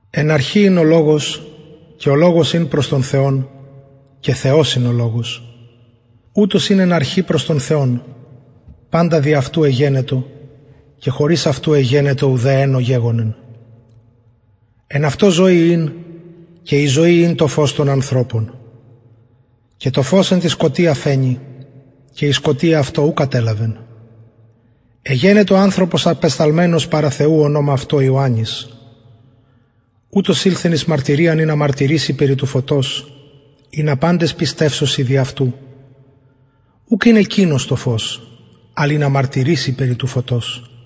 εν αρχη ην ο λογος και ο λογος ην προς τον θεον και θεος ην ο λογος ουτος ην εν αρχη προς τον θεον παντα δι αυτου εγενετο και χωρις αυτου εγενετο ουδε εν ο γεγονεν εν αυτω ζωη ην και η ζωη ην το φως των ανθρωπων και το φως εν τη σκοτια φαινει και η σκοτια αυτο ου κατελαβεν εγενετο ανθρωπος απεσταλμενος παρα θεου ονομα αυτω ιωαννης ουτος ηλθεν εις μαρτυριαν ινα μαρτυρηση περι του φωτος ινα παντες πιστευσωσιν δι αυτου ουκ ην εκεινος το φως αλλ ινα μαρτυρηση περι του φωτος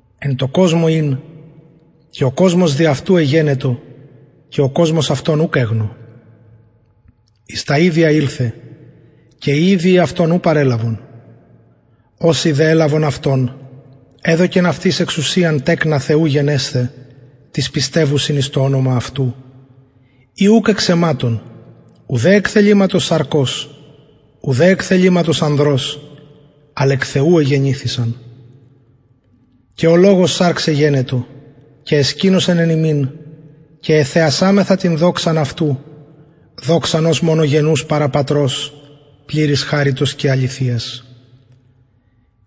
εν τω κοσμω ην και ο κοσμος δι αυτου εγενετο και ο κοσμος αυτον ουκ εγνω εις τα ιδια ηλθεν και οι ιδιοι αυτον ου παρελαβον οσοι δε ελαβον αυτον εδωκεν αυτοις εξουσιαν τεκνα θεου γενεσθαι τοις πιστευουσιν εις το ονομα αυτου οι ουκ εξ αιματων ουδε εκ θεληματος σαρκος ουδε εκ θεληματος ανδρος αλλ εκ θεου εγεννηθησαν και ο λογος σαρξ εγενετο και εσκηνωσεν εν ημιν και εθεασαμεθα την δοξαν αυτου δοξαν ως μονογενους παρα πατρος πληρης χαριτος και αληθειας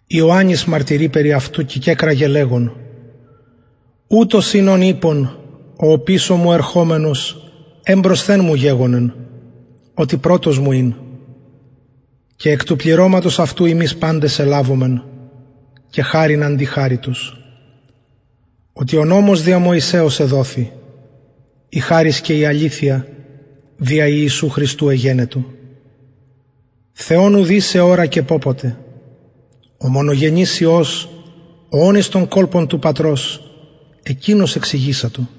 ιωαννης μαρτυρει περι αυτου και κεκραγεν λεγων ουτος ην ον ειπον ο οπισω μου ερχομενος εμπροσθεν μου γεγονεν οτι πρωτος μου ην και εκ του πληρωματος αυτου ημεις παντες ελαβομεν και χαριν αντι χαριτος οτι ο νομος δια μωσεως εδοθη η χαρις και η αληθεια δια ιησου χριστου εγενετο θεον ουδεις εωρακεν πωποτε ο μονογενης υιος ο ων εις τον κολπον του πατρος εκεινος εξηγησατο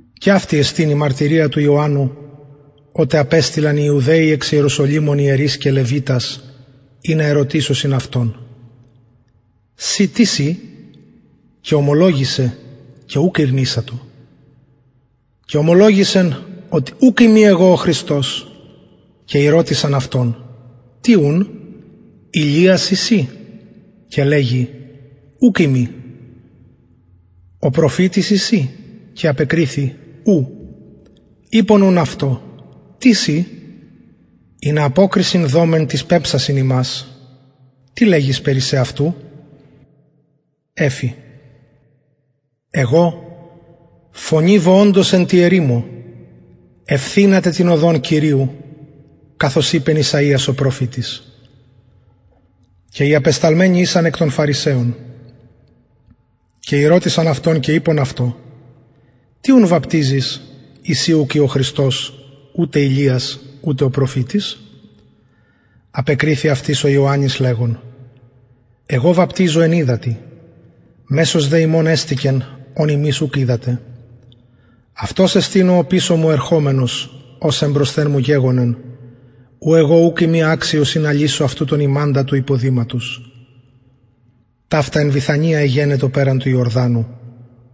και αυτη εστιν η μαρτυρια του ιωαννου οτε απεστειλαν οι ιουδαιοι εξ ιεροσολυμων ιερεις και λευιτας ινα ερωτησωσιν αυτον συ τις ει και ωμολογησεν και ουκ ηρνησατο και ωμολογησεν οτι ουκ ειμι εγω ο χριστος και ηρωτησαν αυτον τι ουν ηλιας ει συ και λεγει ουκ ειμι ο προφητης ει συ και απεκριθη ου ειπον ουν αυτω τις ει ινα αποκρισιν δωμεν τοις πεμψασιν ημας τι λεγεις περι σεαυτου εφη εγω φωνη βοωντος εν τη ερημω ευθυνατε την οδον κυριου καθως ειπεν ησαιας ο προφητης και οι απεσταλμενοι ησαν εκ των φαρισαιων και ηρωτησαν αυτον και ειπον αυτω τι ουν βαπτιζεις ει συ ουκ ει ο χριστος ουτε ηλιας ουτε ο προφητης απεκριθη αυτοις ο ιωαννης λεγων εγω βαπτιζω εν υδατι μεσος δε υμων εστηκεν ον υμεις ουκ οιδατε αυτος εστιν ο οπισω μου ερχομενος ος εμπροσθεν μου γεγονεν ου εγω ουκ ειμι αξιος ινα λυσω αυτου τον ιμαντα του υποδηματος ταυτα εν βηθανια εγενετο περαν του ιορδανου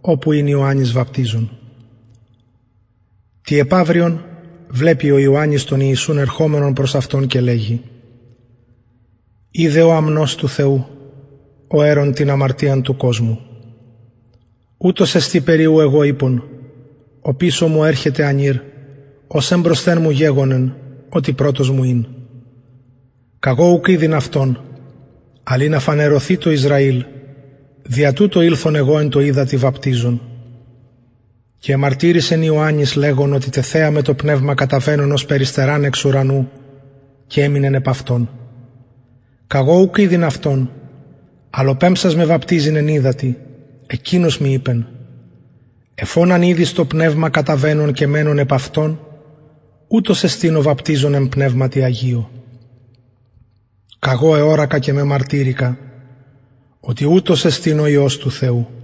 οπου ην ιωαννης βαπτιζων τη επαυριον βλεπει τον ιησουν ερχομενον προς αυτον και λεγει ιδε ο αμνος του θεου ο αιρων την αμαρτιαν του κοσμου ουτος εστιν περι ου εγω ειπον οπισω μου ερχεται ανηρ ος εμπροσθεν μου γεγονεν οτι πρωτος μου ην καγω ουκ ηδειν αυτον αλλ ινα φανερωθη τω ισραηλ δια τουτο ηλθον εγω εν τω υδατι βαπτιζων και εμαρτυρησεν ιωαννης λεγων οτι τεθεαμαι το πνευμα καταβαινον ωσει περιστεραν εξ ουρανου και εμεινεν επ αυτον καγω ουκ ηδειν αυτον αλλ ο πεμψας με βαπτιζειν εν υδατι εκεινος μοι ειπεν εφ ον αν ιδης το πνευμα καταβαινον και μενον επ αυτον ουτος εστιν ο βαπτιζων εν πνευματι αγιω καγω εωρακα και μεμαρτυρηκα οτι ουτος εστιν ο υιος του θεου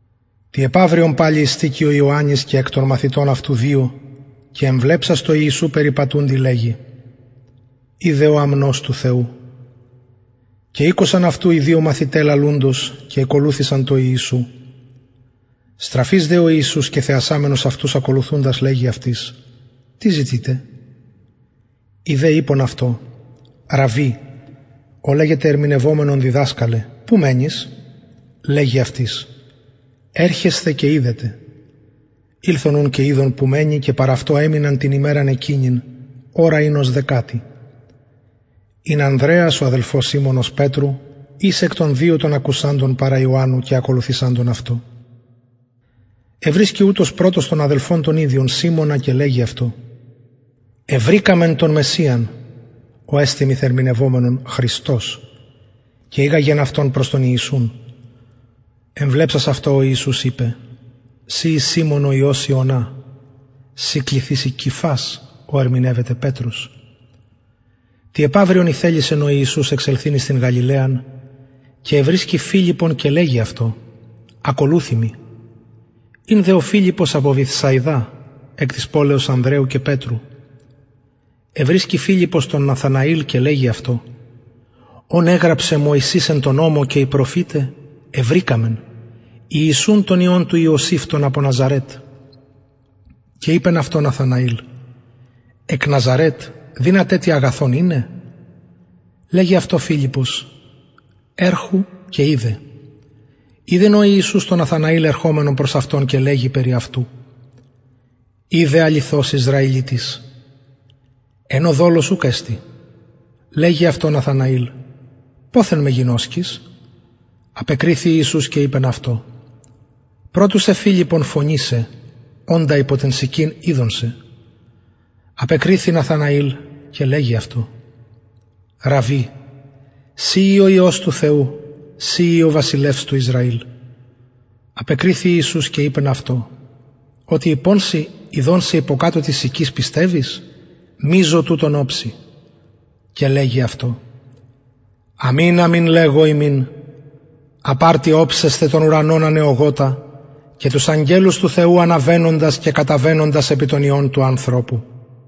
τη επαυριον παλιν ειστηκει ο ιωαννης και εκ των μαθητων αυτου δυο και εμβλεψας τω ιησου περιπατουντι λεγει ιδε ο αμνος του θεου και ηκουσαν αυτου οι δυο μαθηται λαλουντος και ηκολουθησαν τω ιησου στραφεις δε ο ιησους και θεασαμενος αυτους ακολουθουντας λεγει αυτοις τι ζητειτε οι δε ειπον αυτω ραββι ο λεγεται ερμηνευομενον διδασκαλε που μενεις λεγει αυτοις ερχεσθε και ιδετε ηλθον και ειδον που μενει και παρ αυτω εμειναν την ημεραν εκεινην ωρα ην ως δεκατη ην ανδρεας ο αδελφος σιμωνος πετρου εις εκ των δυο των ακουσαντων παρα ιωαννου και ακολουθησαντων αυτω ευρισκει ουτος πρωτος τον αδελφον τον ιδιον σιμωνα και λεγει αυτω ευρηκαμεν τον μεσιαν ο εστιν μεθερμηνευομενον χριστος και ηγαγεν αυτον προς τον ιησουν εμβλεψας αυτω ο ιησους ειπεν συ ει σιμων ο υιος ιωνα συ κληθηση κηφας ο ερμηνευεται πετρος τη επαυριον ηθελησεν εξελθειν εις την γαλιλαιαν και ευρισκει φιλιππον και λεγει αυτω ο ιησους ακολουθει μοι ην δε ο φιλιππος απο βηθσαιδα εκ της πολεως ανδρεου και πετρου ευρισκει φιλιππος τον ναθαναηλ και λεγει αυτω ον εγραψεν μωσης εν τω νομω και οι προφηται ευρηκαμεν ιησουν τον υιον του ιωσηφ τον απο ναζαρετ και ειπεν αυτω ναθαναηλ εκ ναζαρετ δυναται τι αγαθον ειναι λεγει αυτω φιλιππος ερχου και ιδε ειδεν ο ιησους τον ναθαναηλ ερχομενον προς αυτον και λεγει περι αυτου ιδε αληθως ισραηλιτης εν ω δολος ουκ εστιν λεγει αυτω ναθαναηλ ποθεν με γινωσκεις απεκριθη ιησους και ειπεν αυτω προ του σε φιλιππον φωνησαι οντα υπο την συκην ειδον σε απεκριθη ναθαναηλ και λεγει αυτω ραββι συ ει ο υιος του θεου συ ει ο βασιλευς του ισραηλ απεκριθη ιησους και ειπεν αυτω οτι ειπον σοι ειδον σε υποκατω της συκης πιστευεις μειζω τουτων οψει και λεγει αυτω αμην αμην λεγω υμιν απ αρτι οψεσθε τον ουρανον ανεωγοτα και τους αγγελους του θεου αναβαινοντας και καταβαινοντας επι τον υιον του ανθρωπου